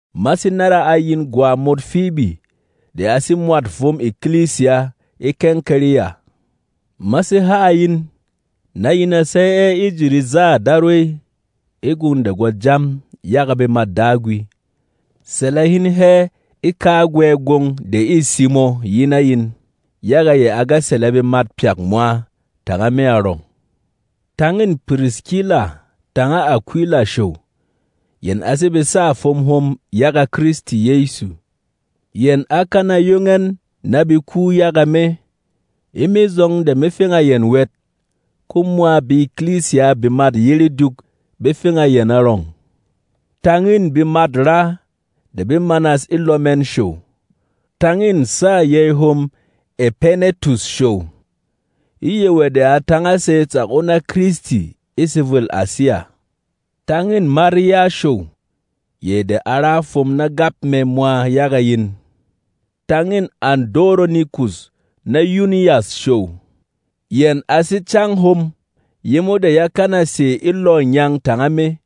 Ma sé nára a yin gwa mot Fibi de a sé mwât fwom ekilisiya e Kɛnkɛrɛya. Ma sé ha a yin, na yin a sey ɛ e ji rezâ Darwey e gwong de gwa jam yaga bemât Dagwi. Sɛlɛ hin hɛ e kagwɛ gwong de ê simo yi na yin, yaga yɛ a ga sɛlɛ bemat pyak mwa tanga me arɔng. Tang în Piriskila tanga Akwila show. Yɛn a sé besâ fwom hom yaga Kristi Yɛsu. Yɛn á kana yong ɛn na be ku yaga me. E me zɔng de me feng a yɛn wɛt, ko mwa be-ekilisiya bemât yére dyuk be feng a yɛn arɔng. Tang în bemat-raa de be manas e lɔ mɛn show. Tang în sâ yey hom Ɛpainɛtus show. E yɛ wɛ de a tānga sey tsak o na Kristi e sevwêl Asiya. Tang în Marya show, yɛ de a ra fwom na gap mɛ mwa yaga yin. Tang în Andoronikus na Yunyas show. Yɛn a sé cáng hom yemo de yá kana sè e lɔ̂ ngyang tanga me.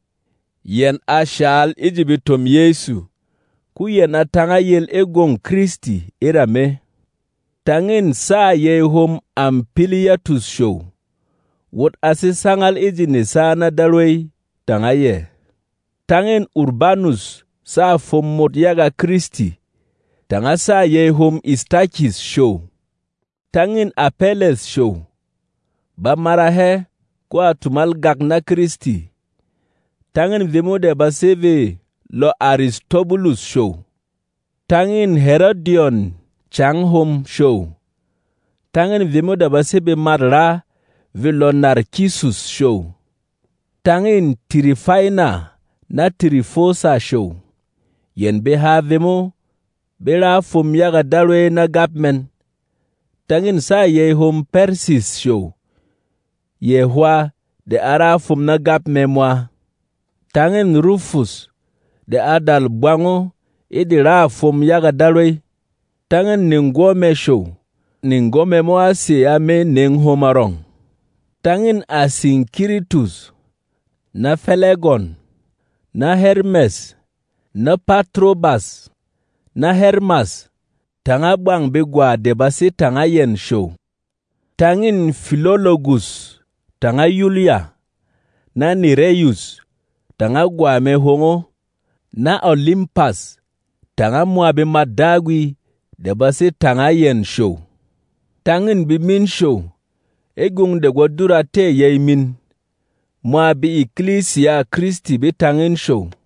Yɛn a shǎl e ji betom Yɛsu, ko yɛn a tānga yel e gwông Kristi e ra me. Tang în sâ yey hom Ampilyatus show. Wot a sé sangal e ji nesa na Darwey tanga yɛ. Tang în Urbanus, sâ fwom mot yaga Kristi, tanga sâ yey hom Istakis show. Tang în Apɛlɛs show. Ba mara hɛ, ko a tumal gak na Kristi. Tang în vemo de ba sé vê lɔ Aristobulus show. Tang în Herodyon, cang hom, show. Tang în vemo de ba sé bemat-raa vê lɔ Narkisus show. Tang în Tirifaina na Tirifosa show. Yɛn beha vemo be ra fwom yaga Darwey na gap mɛn. Tang în sâ yey hom Pɛrsis show, yɛ hwā de a ra fwom na gap mɛ mwa. Tang în Rufus, de a dal bwang o e de râ fwom yaga Darwey, tanga neng-gwɔ mɛ show. Neng-gwɔ mɛ mo á sè a me neng hom arɔng. Tang în Asinkiritus, na Fɛlɛgɔn, na Hɛrmɛs, na Patrobas, na Hɛrmas, tanga bwang begwa de ba sé tanga yɛn show. Tang în Filologus tanga Yulya, na Nɛrɛyus tanga gwa mɛ hwong o, na Olimpas, tanga mwa bemât Dagwi de ba sé tanga yɛn show. Tang în bemin show e gwong de gwo dura tɛ̂ yey min. Mwa be-ekilisiyâ Kristi be tang in show.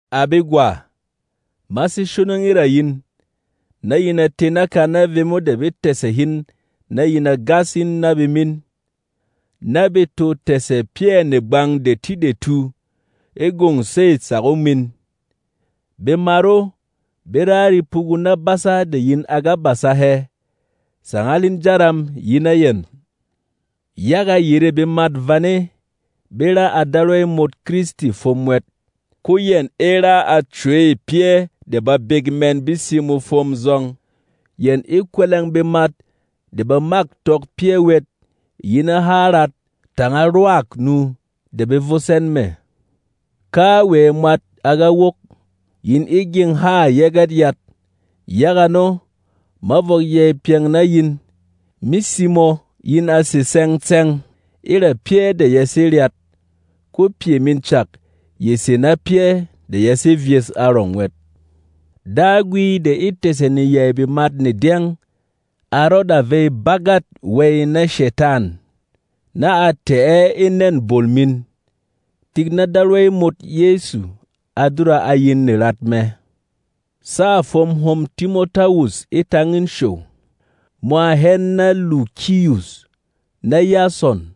À begwa, ma sé shonong e ra yin, na yin a tē naka na vemo de be tɛ̀sɛ hin na yin a gas in na bemin, na be to tɛ̀sɛ pyɛ̂ negbang detidetu e gwông sêy tsak o min. Bemat o be ra repugu na basa de yin a ga basa hɛ. Sangal hin jaram yi na yɛn! Yaga yerê bemat vane be ra a Darwey mot Kristi fwom wɛt, ko yɛn e ra a cwey pyɛ́ de babek mɛn be simo fwom zɔng. Yɛn e kwɛlɛng bemat de ba mâk tɔk pyɛ́ wɛt yi na há rat tanga rwâk-nu de be vos ɛn mɛ̀. Kawɛ mwat a ga wok, yin e gyeng hâ Yɛgɛt Yat. Yaga ano, ma vɔk yey pyɛng na yin. Me simo yin a sè tsɛng-tsɛng e ra pyɛ́ de ya sé ryat; ko pyɛ min cak ye sè na pyɛ́ de ya sé vyes arɔng wɛt. Dagwi de e tɛ̀sɛ neyey bemat ne dyɛng a rɔda vey bagât wey na Shetan, na a tɛ̀ ɛ e nɛ̂n bol min. Tik na Darwey mot Yɛsu a dura a yin nerat mɛ. Sâ fwom hom Timotawus e tang in show, mwa hɛn na Lukiyus, na Yasɔn,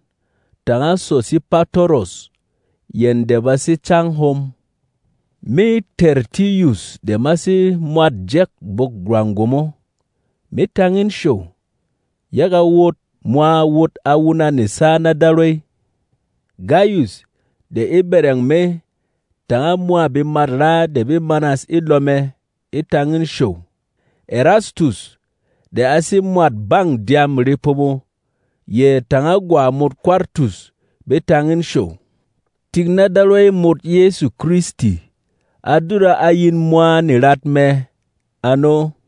tanga Sosipatoros, yɛn de ba sé cáng hom. Me, Tɛrtiyus de ma sé mwat jɛ̂k bwok-rwang gwomo, me tang in show, yaga wot mwa wot a wuna nesa na Darwey. Gayus de e bɛrɛng me tanga mwa bemat-raa de be manas e lɔ mɛ e tang in show. Ɛrastus, de a sé mwât bâng dyâm repomo, yɛ tanga gwa mot Kwartus be tang in show. [Tik na Darwey mot Yɛsu Kristi a dura a yin mwa nerat mɛ. Ano.]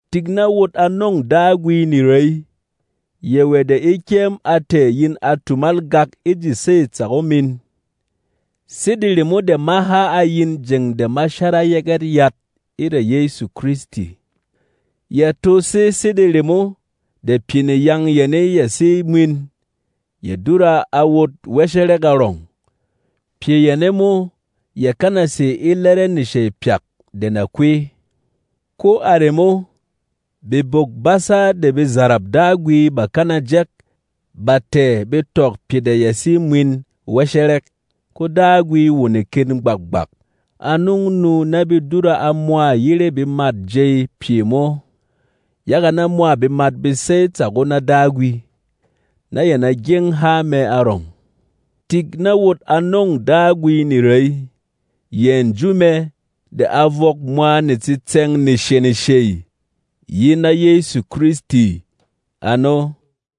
Tik na wot a nɔ̂ng Dagwi nerey! Yɛ wɛ de e kyɛm a tɛ̀ yin a tumal gak e ji sêy tsak o min, sede remo de ma ha a yin jeng de ma shara Yɛgɛt Yat e ra Yɛsu Kristi. Ya to sé sede remo de pyɛ neyaang yane de ya sé mwin ya dura a wot wɛshɛrɛk arɔng. Pyɛ yane mo yà kana sè e lɛrɛ neshey pyak de na kwey. Ko a remo, bebok-basa de bezarap Dagwi bà kana jɛk ba tɛ̀ be tɔk pyɛ de ya sé mwin wɛshɛrɛk. Ko Dagwi wo neken gbak-gbak a nɔng nu na be dura a mwa yére bemât jey pyɛ mo, yaga na mwa bemat be sey tsak o na Dagwi, na yɛn a gyeng há mɛ arɔng. Tik na wot a nɔ̂ng Dagwi nerey, yɛ nju mɛ de a vɔk mwa netsitsɛ̂ng nesheneshey, yi na Yɛsu Kristi! Ano.